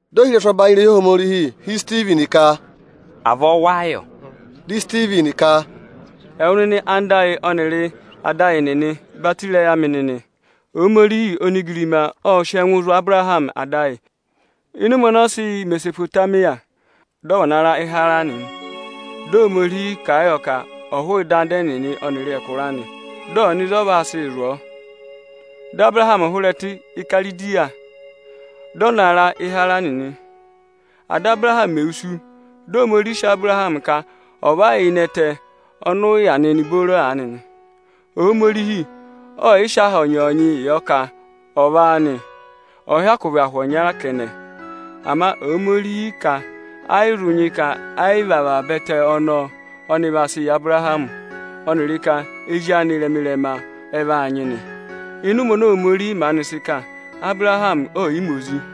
Dị ohirẹsụ ọbanyị irehi Ohomorihi họ̀ Isitivini ka, “Avọọ wáá yọ?” Dị Isitivini ka, “Ẹwụ nịnị anda ayị ọnịrị ada ayị nịnị, batọ ịrẹyị amị nịnị! Ohomorihi onigirima ộ sị ẹngụ zụ̀ Abụrahamị ada ayị, ịnị ụmẹ ọnọọ sị yà Imesopotamiya, dị ọ va na ra Ị́haraanị. Dị Ohomorihi kà a yọ ka ọ̀ hụụ ịdị anda ẹnịnị ọnịrị ẹkụra anị, dị ọ̀ nọ ịzị ọnị vaa sị zụ̀ ọọ. Dị Abụrahamị hụrẹ ẹtẹ Ikaridi, dị ọ na ra Ị́haraanị nị. Áda Abụrahamị mè wusu, dị Ohomorihi sị Abụrahamị ka ọ̀ va yà ịnị ẹtẹ ọnị ụ yà nịnị booro aanị nị. Ohomorihi ọ yị sị aha ọnyọọnyịị yọ ka ọ̀ vị áanị, ọ̀ọ hyakụ vị ahụ ọnya kẹnẹ. Ama Ohomorihi ka ẹ yị zụ nyị ka ayị vị avaba ẹtẹ ọnọọ ọnị vaa sịị yị Abụrahamị, ọnịrị ka ezi anị ịrẹma-ịrẹma ẹ vaa nyị nị. Ịnị ụmẹ oni Ohomorihi maanị sị kà, Abụrahamị ọọ̀ yị ma ozi,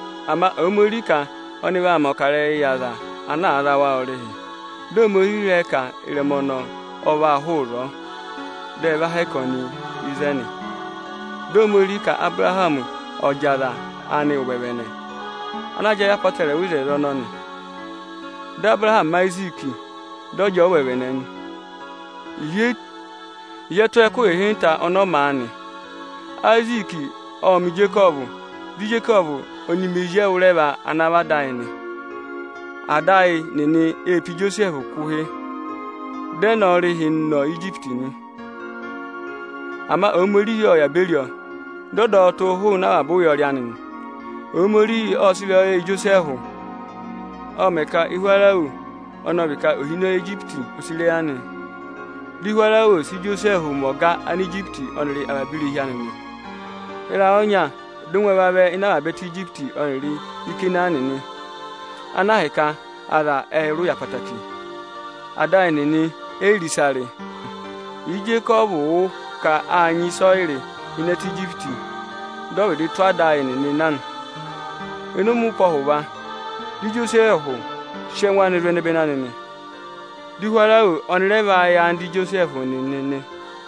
Ama Ohomorihi ka ọnị vaa mẹ̀ ọkarẹyị yị aza ana za wa ọrịhị. Dị Ohomorihi rẹ ka ịrẹma ọnọọ, ẹ vaa hụụ ịzọọ, dị ẹ va hẹkẹ ọnị ịzẹnị. —35.18Dị Ohomorihi ka Abụrahamị ọ̀ jị aza anị ụvẹvẹnẹ, ana jẹẹ yị apọtẹrẹwa oto ọnọọ nị. Dị Abụrahamị ma Ayiziiki, dị ọ jị ọọ ụvẹvẹnẹ, ịhị ẹ tụ́ ọọ ẹkụhị ịhịnta ọnị ọ ma a nị. Ayiziiki ộ ma Ijekọvụ, dị Ijekọvụ ọnị ma ezi ẹwụrẹva ana vị ada ayị nị. “Ada ayị nịnị ê pe Ijosẹẹhụ kụ̀ ụhị, dị ẹ ná a ọrịhị nọ Ijipiti nị. Ama Ohomorihi ộ yà beri ọ, dị ọ dọ ọ tụ́ hụụnị avaba ụyọrị anị nị. Ohomorihi ộ sị ịrẹyọyẹ yị Ijosẹẹhụ, ộ mẹ̀ ka Ihwarawo, ọnị ọ vị ka ohinọyị Anijipiti ò sì ịrẹyị anị. Dị Ihwarawo sị Ijosẹẹhụ mẹ ọga Anijipiti ọnịrị avaba irehi anị nị. Ịrayị ọnya dị ụngwẹ vavẹ ịnị avaba ẹtẹ Ijipiti ọnịrị Ikanaani nị, ana ahịka aza ệ rị ụya ẹtẹẹtẹrẹ. Ada ayị nịnị e yi re ịsa rị. Ịjị Ijekọvụ wụ́ ka â nyị ịsọyịrị ịnị ẹtẹ Ijipiti, dị ọ vịdị tụ́ ada ayị nịnị na nị. Ẹ́ mẹ̀ vana na ụpẹ ọhụva, dị Ijosẹẹhụ sị ẹngụ anị zụ̀ ẹnẹbẹnị anị nị, dị Ihwarawo ọnị rẹ va yẹ anda Ijosẹẹhụ nịnị nị.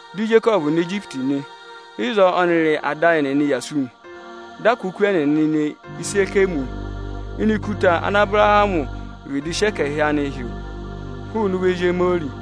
Dị Ijekọvụ nọ Ijipiti nị. Ịzọọ ọnịrị ada ayị nịnị yà sú nị. Dị a kụ́ oku ẹnịnị ne ne Ịsẹkẹmị ini ikuta ana Abụrahamị vịdị sị ẹkẹhị hị́ hụụnị ụvọ ezi Ihamori nị.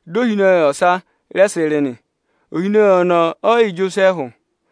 Dị ohinọyị ọsa rẹ sị rị nị. Ohinọyị ọnọọ ọ yị yẹ Ijosẹẹhụ.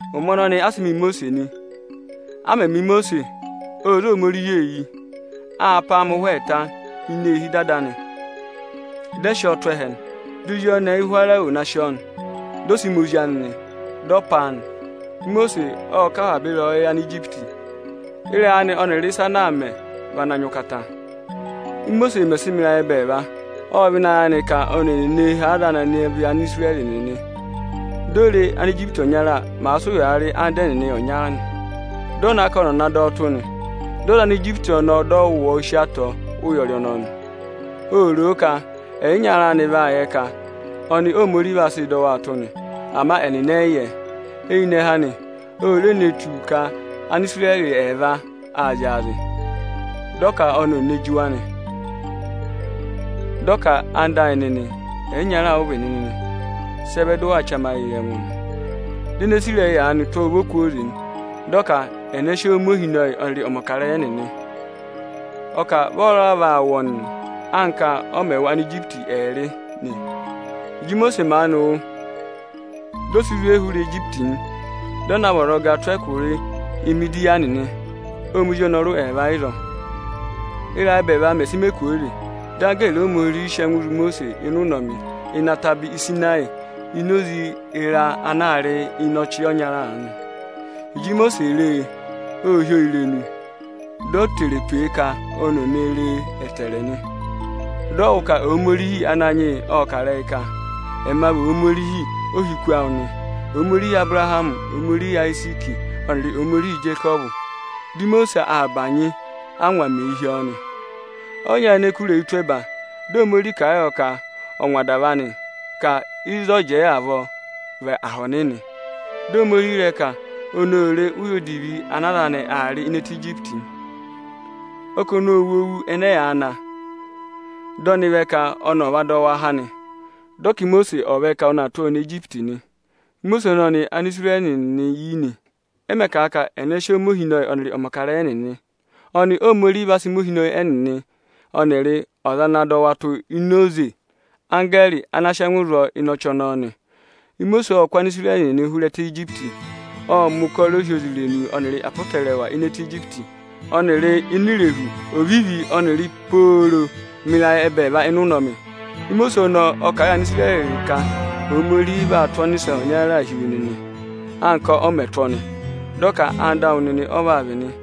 Ụmẹ ọnọnị a sị ma Imosiisi nị. A mẹ̀ ma Imosiisi, ô zé Ohomorihi eyi. Â pá a mẹ ụhwẹ ẹẹta ini eehi ịdị ada anị. Dị ẹ sị ọ tụ̀ ẹhẹ, di ozi ọnẹẹ Ihwarawo na sị ọ, dị ọ sị mẹ ozi anị, dị aa pá a nị. Imosiisi ộ kọ avaba ịrẹyọyẹ Anijipiti. Ịrẹyị anị ọnịrị ịsa ana aa mẹ, vị ana nyị ụkata. “Ímosiisi mẹ̀ sị mẹ ịrayị ẹbẹẹva, ộ vẹ ịnị ayị anị ka oni ee nee hee aza anị ana vị Anisirẹrị nịnị. Di o re, Anijipiti ọnya màa sị ụyaa rị anda ẹnịnị ọnya nị. Dị ọ na ka ọnị ọ̀ na dọ ọ tụ́ nị. Dị ọ za Anijipiti ọnọọ, dị ọ wụ̀ ọ sí atọ ụyọrị ọnọọ nị. Ô ro ka aza anị vaa yẹ ka ọnị Ohomorihi vaa sịị dọ waa tụ́ nị, ama ẹnịnị ẹ yị yẹ. Eyinẹhẹ anị, o re ne tù ka Anisirẹrị ẹẹva aa zyaazị. Dị ọ ka oni ee nee ji wa nị. Dị ọ ka: ‘Ẹwụ nịnị ẹyịnyara amị, ẹyịnyara ụ vị nịnị nị, sị ẹ vẹ dị ụ waa chamayịị yị ẹngụ nịnị?’ Di ene sì ịrẹyị aanị tụ́ ọ ụvọ kwooze, dị ọ ka ẹnẹ sị ọọ mẹ ohinọyị ọnịrị ọmọkarẹyị ẹnịnị? Ọ kà vị ọ́ọ́ raa vaa wụ̀ ọnị, anka ọ mẹ̀ wụ Anijipiti ẹẹrị nị? Ịjị Imosiisi maanị wụ́, di o si zwe hụrẹ Ijipiti, dị ọ na vị ọzọga tụ́ ẹkụra Imidiyani nị. Ộ ma ozi ọnọrụ ẹẹva ịzọọ. “Ị́rayị ẹbẹẹva mẹ̀ sị mẹ kwooze, dị anggẹẹrị Ohomorihi sị ẹngụ zụ̀ Imosiisi ịnị ụnọmị ịnị ataba Ịsịnayị ini oze ịra ana aa rị ịnị ọchị ọnya aanị. Ịjị Imosiisi re e, ô hí oo irenu, di o tere pe e ka oni ò re e ẹtẹẹrẹ nị. Dị ọ wụ́ ka Ohomorihi Ananyị yị ộ kà ịrẹyị ka: ‘Ẹma vị Ohomorihi ohiku awụ nị, Ohomorihi Abụrahamị, Ohomorihi Ayiziiki ọnịrị Ohomorihi Ijekọvụ.’ Dị Imosiisi aa bànyị, ángwa mèe hí ọọ nị. Ọ yị nyayịnẹ kụ̀rà eyi tụ́ ẹba. Dị Ohomorihi kà a yọ ka ọ̀ ngwa adava anị, ka ịzọọ jẹẹ avọọ, vị aha ọnịnị. Dị Ohomorihi ka oni ô re ụya odivi ana aza anị aa rị ịnị ẹtẹ Ijipiti. Ọ kà ọnị ộ wụ́ owu ẹnẹ ẹyaa na, dị ọnị vẹ ka ọnị ọ̀ va dọ wa há nị. Dị ọ ka Imosiisi ọ̀ vẹ ka ọnị aa tụ́ ọọ nọ Ijipiti nị. “Imosiisi ọnọnị Ánisirẹrị nịnị yi nị, ẹ mẹ̀ kà a ka ẹnẹ sị ọọ mẹ ohinọyị ọnịrị ọmọkarẹyị ẹnịnị? Ọnị Óhomorihi va sị mẹ ohinọyị ẹnịnị ọnịrị ọza ana dọ wa tụ́ ini oze anggẹẹrị ana sị ẹngụ zụ̀ ọọ ịnị ọchị ọnọọ nị. Imosiisi ộ kụ́ Anisirẹrị nịnị hụrẹ ẹtẹ Ijipiti. Ộ mẹ̀ ụkọrọ ohyozirenu ọnịrị apọtẹrẹwa ịnị ẹtẹ Ijipiti ọnịrị ini Irehu Ovivi ọnịrị pooro mẹ ịrayị ẹbẹẹva ịnị ụnọmị. Imosiisi ọnọọ ộ kà a yị Anisirẹrị ka Ohomorihi vaa tụ́ ọnịsẹ ọnyaa hi wa anka ọ mẹ̀ tụ́ ọnị. Dị ọ ka anda awụ nịnị ọ vaa vị nị.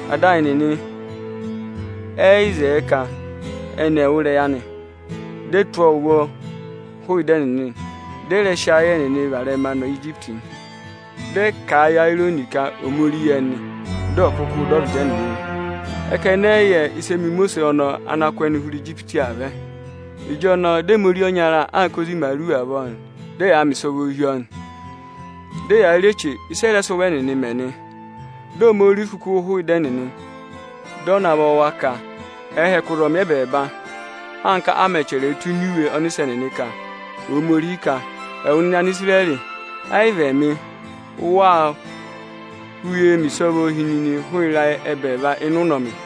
“Ada ayị nịnị ẹ yị zẹẹ ka ẹnị ẹ̀ wụ́ ịrẹyị anị, dị ẹ tụ́ ọọ ụvọ hụụ ịdị ẹnịnị, dị ẹ raà sị ayị ẹnịnị varẹma nọ Ijipiti nị. Ệ kà a yị Eerọnị ka ọ̀ mẹ ori yị ẹnị, dị ọ̀ kụkụụ dọ ọvịdị ẹnịnị. Ẹ ka ẹnị ẹ yị yẹ ịsị ẹ mẹ Imosiisi ọnọọ ana kụ́ ẹnị hụrẹ Ijipiti aa vẹ. Ịjọnọọ dị ẹ mẹ ori ọnya anka ozi imaaru avọọ, dị ẹyaa mẹ ịsọvọọ hi ọọ, dị ẹyaa rị eche ịsị ẹ rẹ sị ụvọ ẹnịnị mẹ nị. Ohomorihi ộ vaa ịrẹma ẹnịnị, dị ọ navọ wa ka ẹẹ hẹkẹ ụzọmị ẹbẹẹba, anka a mẹ̀ chẹrẹ ẹ tụ́ ini iwe ọnịsẹ nịnị ka.” Ẹwụ nịnị Anisirẹrị, ẹ yị vị ẹmị ụ waa wụ̀ uyee mẹ ịsọvọọ hi nịnị hụrẹ ịrayị ẹbẹẹva ịnị ụnọmị.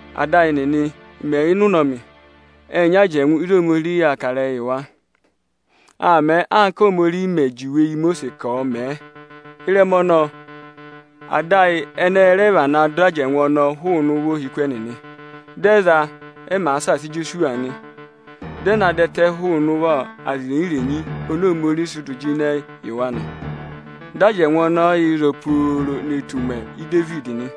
“Áda ayị nịnị mẹ̀ yà ịnị ụnọmị, ệ nyị ajẹngụ ịzị Ohomorihiī yàa kà ịrẹyịị yị wa. Â mẹẹ anka Óhomorihi mè juwe yị Imosiisi ka ọ̀ mẹ̀ ẹ. Ịrẹma ọnọọ, ada ayị ệ rẹ vana dọ ajẹngụ ọnọọ hụụnị ụvọ ohiku ẹnịnị. Dị ẹ za a, ẹ màa saasa Ijosuwa nị. Dị ẹ na dọ ẹtẹ hụụnị ụvọ aza irenyi-irenyi oni Ohomorihi sị dụ jịnẹ yị wa nị. Dị ajẹngụ ọnọọ yà ịzọọ pooro ne tù ụmẹ Idevidi nị.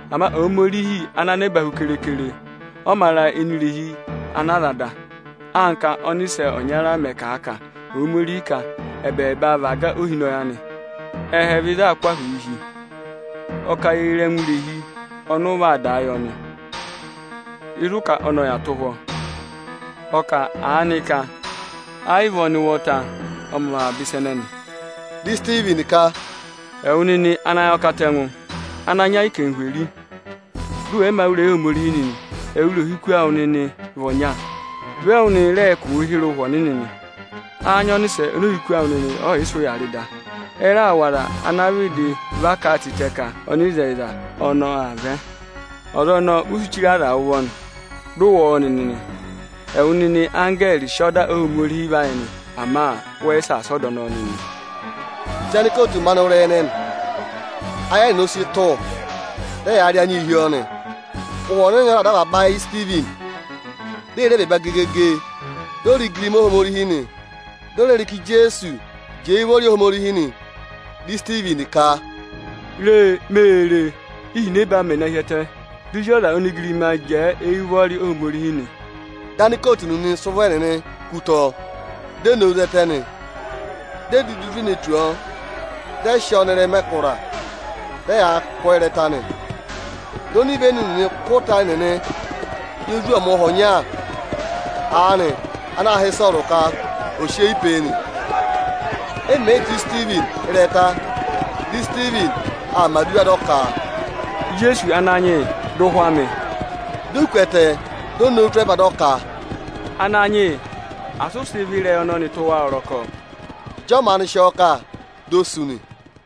Ama Ohomorihi ọgọdọgọdọ ọnị ụvọ ọza è yi mè tù ọ mā ra ini irehi ana aza dà; anka ọ́nịsẹ ọnya mẹ̀ kà a ka Ohomorihi ka, ‘ẹbẹẹba vị aga ohinọyị anị, ẹhẹ vị ịzị aā kụ́ ahụụ hi, ọ ka ye re ẹngụ irehi ọnị ụ vaa dàa yị ọnị; ịzị ụ ka ọnị ọ̀ yà tụ́ ụhwọ́?’ Ọ kà aanị ka ayị vị ọnị ụvọta ọ mẹ avaba ịsa ẹnẹnị?” Di Isitivini ka, “Ẹwụ nịnị anayọkatẹngụ, ana nyị ayị anarịmadọwụ, dị ụ wẹ̀ yị mā wụ́ ịrẹyị Ohomorihi nịnị. Ẹwụrị ohiku awụ nịnị vị ọnya, vị ẹwụ nịnịị̄ rẹẹ kụ̀ụ hịrẹ Ụhwẹ Ọnịnị nị. Áá nyị ọnịsẹ oni ohiku awụ nịnị ọ̀ yị sị ụya rị da? Ẹ raà wụ̀ aza ana vịdị va kà a tịtẹ ka Ọnịzẹyịza ọnọọ aa vẹ. Ọza ọnọọ u si chire aza ụvọ, dị ụ wụ̀ ọ nịnị nị. Ẹwụ nịnị anggẹẹrị sị ọda Ohomorihi va yị nị, ama wẹ yị saasa ọda ọnọọ nịnị.” Ịjị anikootu maanị wụ́ ịrẹyị ẹnẹnị, ayị ẹnẹnị ọ sị tụ̀, dị ẹyaa rị anyịị hi ọọ nị. Ụhwẹ Ọnịnị ọ raà dọ avaba ayị Isitivini, di ee re ẹbẹẹba gegege, di o re igirima Ohomorihi nị. Di o re re ka Ijeesu jẹẹ éyi ụvọrị Ohomorihi nị. Dị Isitivini ka, “Re! Mee re, íhinẹbaa mẹ̀ na hi ẹtẹ, di Ozi ọza onigirima jẹẹ éyi ụvọrị Ohomorihi nị!” Dị anikootu nịnị sị ụvọ ẹnịnị kú ụtọ, di e nowu zẹtẹ nị. Di e dudu zwe ne tù ọ, dị ẹ sị ọọ nọ ịrẹma ẹkụra, dị ẹyaa kụ̀ ọọ ịrẹta nị. Di onivenu nịnị kụ́ ịta ẹnịnị yị ozwọọmụha ọnya aanị ana aā hị́ Ịsọọrụ ka ò sị eyi pe e nị. E mèe yii tụ́ Isitivini ịrẹta, dị Isitivini aa mẹ̀ aduwa dị ọ ka, “Ijeesu Ananyị yị, dọ ụhwẹ amị!” Di o ku ẹtẹ, di o nowu tụ́ ẹba dị ọ ka, “Ananyị yị, asị ụ sị ịvị ịrẹyị ọnọnị tụ́ wa ọrọkọ!” Ịjị ọ maanị sị ọọ kà, di o sú nị.